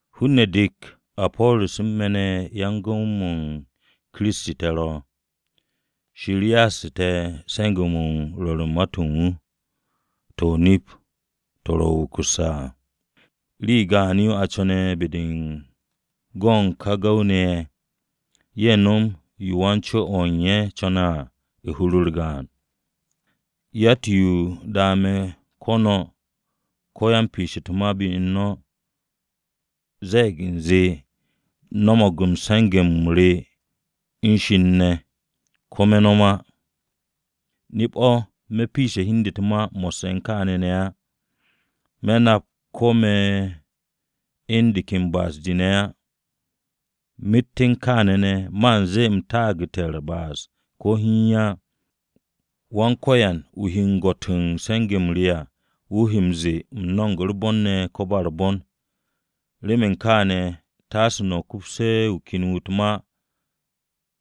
Hun-ne̱ dek, Apo̱ro̱s u̱n me̱ ne̱ yan-gu̱w-m Kiristi te̱ ro̱. Shir ya'astu̱ te̱ se̱nge̱-mo̱ u̱n rwo̱r u̱n ma-to̱ u̱n wu̱, to̱ o-nip to̱ ro̱ wukusse̱ à. Rii gaan-yo a co̱ne̱ be-de u̱n go̱ u̱n ka gu̱w-ne̱ ye̱, ye̱ nom yo wan-co-o̱ ye̱ co̱ne̱ à, hur-u̱r gaan. Yatt-yo da me̱ ko̱ no̱, ko̱ yan-piish u̱t-ma be u̱n no̱, ze̱e̱g u̱nze u̱m no̱mo̱g se̱nge̱-m re me̱ u̱n Shir ne̱, ko̱ me̱ no̱m á. Nip-o̱, me̱ u̱n piishe̱ u̱n hi u̱n de u̱t-ma mo̱sse̱ u̱n kaane̱ ne̱ á. Me̱ nap ko̱ me̱ u̱n de ken ba'as-de ne̱ á, myet u̱n kaane̱ ne̱, man zee u̱m taagu̱te̱ u̱r-ba'as ko̱ hiin á. Wan-Ko̱yan wu̱ he gwo̱t u̱n se̱nge̱-m re à wu̱ he m-ze̱e̱ u̱m no̱mo̱g u̱r-bon ne̱ ko̱ ba u̱r-bon. Remen kaane̱, taase no̱ kupse̱ wu̱ ken wu̱ u̱t-ma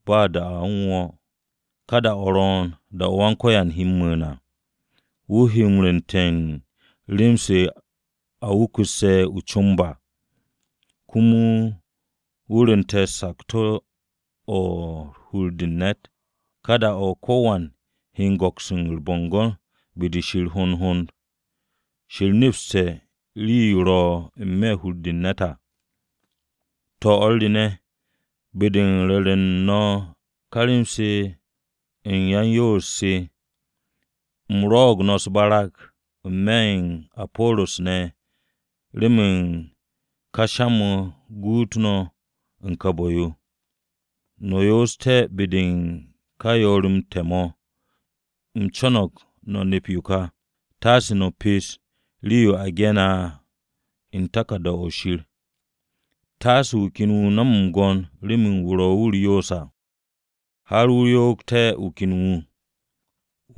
ba da-o̱ u̱n wo̱o̱. Ka da-o̱ ro̱o̱n, da-o̱ Wan-Ko̱yan he mu̱u̱n à. Wu̱ he rwu̱u̱nte̱ u̱n rem-se ro̱ wukusse̱ o-comb à, komo wu̱ rwu̱nte̱ sakto̱-o̱ ro̱ u̱n hur-de u̱n ne̱t à. Ka da-o̱ o̱ ka ko̱wan he go̱ks u̱r-bo̱ngo̱n be-de Shir hond hond Shir nepste̱ ka rii-yo ro̱ n-me̱ hur-de u̱n ne̱t à. To̱, o̱r re ne̱, be-de u̱n ru̱re̱ u̱n no̱ ka rem-se u̱n ya-u̱r-yoos se, u̱m rwo̱'o̱g no̱ u̱s-barag n-me̱ u̱n Apo̱ro̱s ne̱ remen ka sha-mo̱ guut no̱ u̱n ka bu̱-yo. No̱ yoos be-de u̱n ka yoor-m te̱ mo̱ u̱m co̱no̱g no̱ nep yo ka: “Taase no̱ pes rii-yo a ge̱ne̱ à u̱n taku̱rda-o̱ Shir.” Taase wu̱ ken wu̱ nom m-gwo̱n remen wu̱ ro̱ wu̱ m-yoose̱ à, har wu̱ yo'og wu̱ ken wu̱.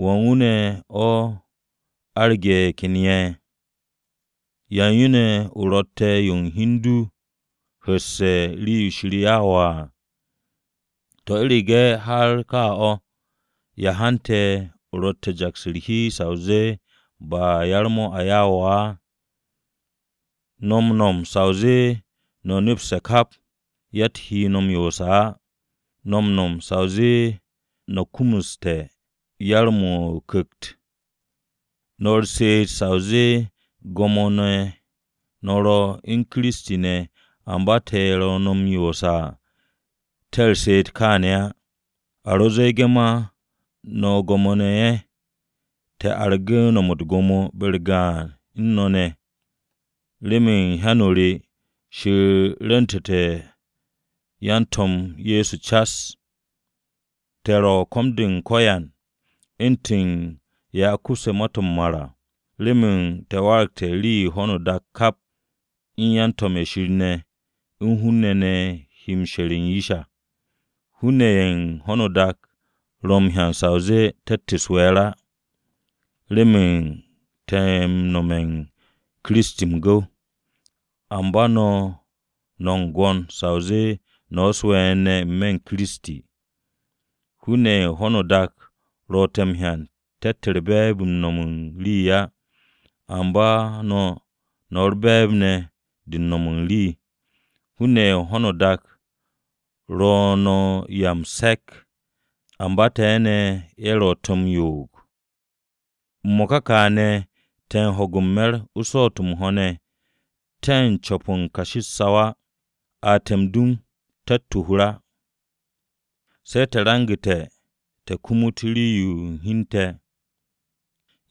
¿Wan wu̱ ze̱e̱ o aragte̱ ye̱ ken ye̱? ¿Yan yo ne̱ o ro̱tte̱ yo u̱n hi u̱n du hu̱sse̱ rii-yo Shir ya'u̱ wo̱ à? To̱, u̱rege̱ har kaa o̱, ¿ya hante̱ o ro̱tte̱ u̱n jaks u̱r-hi sa o zee ba yar-mo̱ a ya'u̱ wo̱ á? No̱ m-no̱m sa o zee no̱ nepse̱ kap. Yatt-wu̱ he no̱ m-yoose̱ á. No̱ m-no̱m sa o zee no̱ kumuste̱ yar-mo̱ o-Ku̱kt. No̱ u̱r-she'et sa o zee gwo̱mo-ne̱ no̱ ro̱ u̱n Kiristi ne̱ amba te̱ ye̱ ro̱ no̱ m-yoose̱ à te̱ u̱r-she'et kaane̱ á. A ro ze̱e̱ge̱ ma no̱ gwo̱mo-ne̱ ye̱, te̱ argu̱ no̱m u̱t-gwo̱mo be-u̱r gaan u̱n no̱ ne̱! Remen u̱n hyan-o re, Shir rwu̱ntu̱te̱ na yan-To̱m Ye̱so cas. Te̱ ro̱ ko̱m-de u̱n ko̱yan, u̱ntu̱n ye̱ a kupse̱ ma-to̱ m-mar à. Remen te̱ waragte̱ rii-yo ho̱no o-dak kap, u̱n yan-to̱m ye̱ Shir ne̱, u̱n hun-ne̱ ne̱ he she̱re̱ u̱n yish à. Hun-ne̱ ye̱ u̱n ho̱no o-dak ro̱ m-hyan sa o zee te̱tt u̱s-we̱e̱r á remen te̱ ro̱ m-nome̱ u̱n Kiristi m-gu̱w. Amba no̱, no̱ m-gwo̱n sa o zee no̱ u̱s-we̱e̱r ne̱ n-me̱ u̱n Kiristi! Hun-ne̱ ye̱ u̱n ho̱no o-dak ro̱ te̱ m-hyan te̱tt be̱e̱b-de m-no̱m u̱n rii á. Amba no̱, no̱ u̱r-be̱e̱b ne̱ de m-no̱m u̱n rii. Hun-ne̱ ye̱ u̱n ho̱no o-dak ro̱ no̱ u̱n 'ya m-se̱k, amba te̱ ne̱ ye̱ ro̱ te̱ m-yo'og! M-mo̱ka kaane̱ te̱ u̱n ho̱ge̱ u̱n me̱r u̱n swo̱o̱t-o̱ m-ho̱ ne̱, te̱ u̱n co̱p u̱n kashi u̱t-saw á, a te̱ m-dum te̱tt o-hur á. Se̱ te̱ rangu̱te̱ te̱ kumut rii-yo u̱n hi u̱n te̱.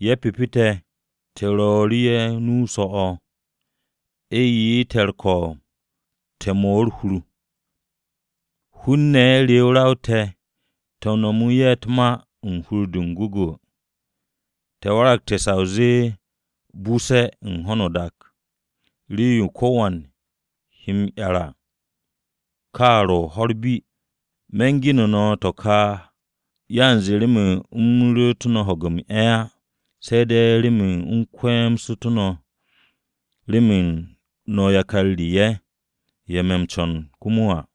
Ye̱ pyepe te̱, te̱ ru̱'u̱ru̱ ye̱ nu-o so̱-o̱, a ye'e̱ te̱ u̱r-ko̱o̱b te̱ m-'mo̱ u̱r-hur. Hun-ne̱ re ra-o te̱, te̱ nomo ye̱ u̱t-ma u̱n hur-de m-gwu̱gwu̱. Te̱ waragte̱ sa o zee buse̱-o̱ u̱n ho̱no o-dak, rii-yo ko̱wan ro̱ m-'yar à, ka ro̱ ho̱-u̱r bi. Me̱ u̱n gene̱ no̱ to̱ ka yanze remen u̱m ru̱'u̱t no̱ ho̱ge̱ m-'e̱ á, se̱ de̱ remen u̱m kye̱we̱stú̱ no̱ remen no̱ yakar re ye̱, ye̱ me̱ m-co̱n komo à.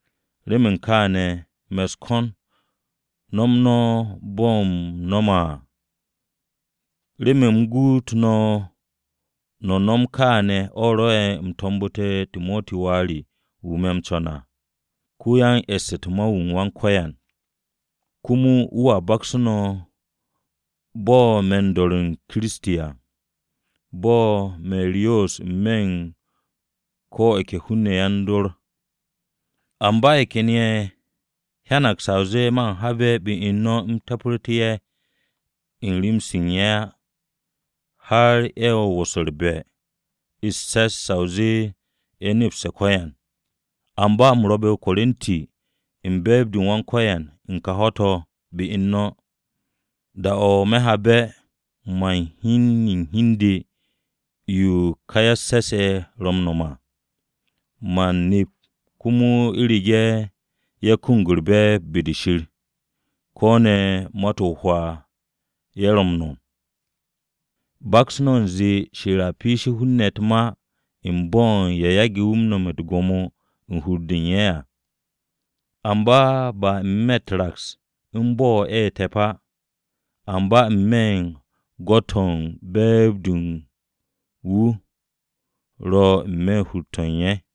Remen kaane̱ me̱ u̱s-ko̱n no̱m no̱ bo̱ u̱m no̱me̱ à. Remen u̱m guut no̱ m-no̱m kaane̱ o̱ rwo̱'e̱ u̱m to̱mbu̱te̱ Timoti wà re wu̱ me̱ m-co̱n à. Ko-yan-e̱ss u̱t-ma wu̱ u̱n Wan-Ko̱yan. Komo wu̱a baksu̱ no̱ bo̱ me̱ u̱n dor Ye̱so Kiristi à bo̱ me̱ u̱r-yoos n-me̱ u̱n ko̱ ye̱ ke hun-ne̱ ye̱ yan-dor à. Amba ye̱ ken ye̱ hyanag sa o zee man habe̱ be u̱n no̱ u̱m te̱pe̱rtu̱ ye̱ u̱n rem-se ye̱ á, har ye̱ u̱n wo̱s u̱r-be̱ u̱s-se̱s sa o zee ye̱ nepse̱ ko̱yan. Amba u̱m rwo̱be̱ o-Korinti u̱n be̱e̱b-de u̱n Wan-Ko̱yan u̱n ka ho̱-to̱ be u̱n no̱. Da-o̱ me̱ habe̱ man hyen u̱n hi u̱n de yo ka ya-u̱s-se̱s ye̱ ro̱ m-no̱m à. Man nep komo u̱rege̱ ye̱ kumug u̱r-be̱e̱b be-de Shir, ko̱ ne̱ ma-to̱ o-hwaa ye̱ ro̱ m-no̱m. Baks no̱ u̱nze Shir ro̱ m-piishe̱ hun-ne̱ u̱t-ma u̱n bo̱ ye̱ yage̱ wu̱ no̱mte̱ u̱t-gwo̱mo u̱n hur-de u̱n ye̱ á, ba n-me̱ raks u̱n bo̱ ye̱ ro̱ te̱p á, amba n-me̱ m-gwo̱t ko̱ be̱e̱b-de u̱n wu̱ ro̱ n-me̱ hur-to̱ ye̱ à.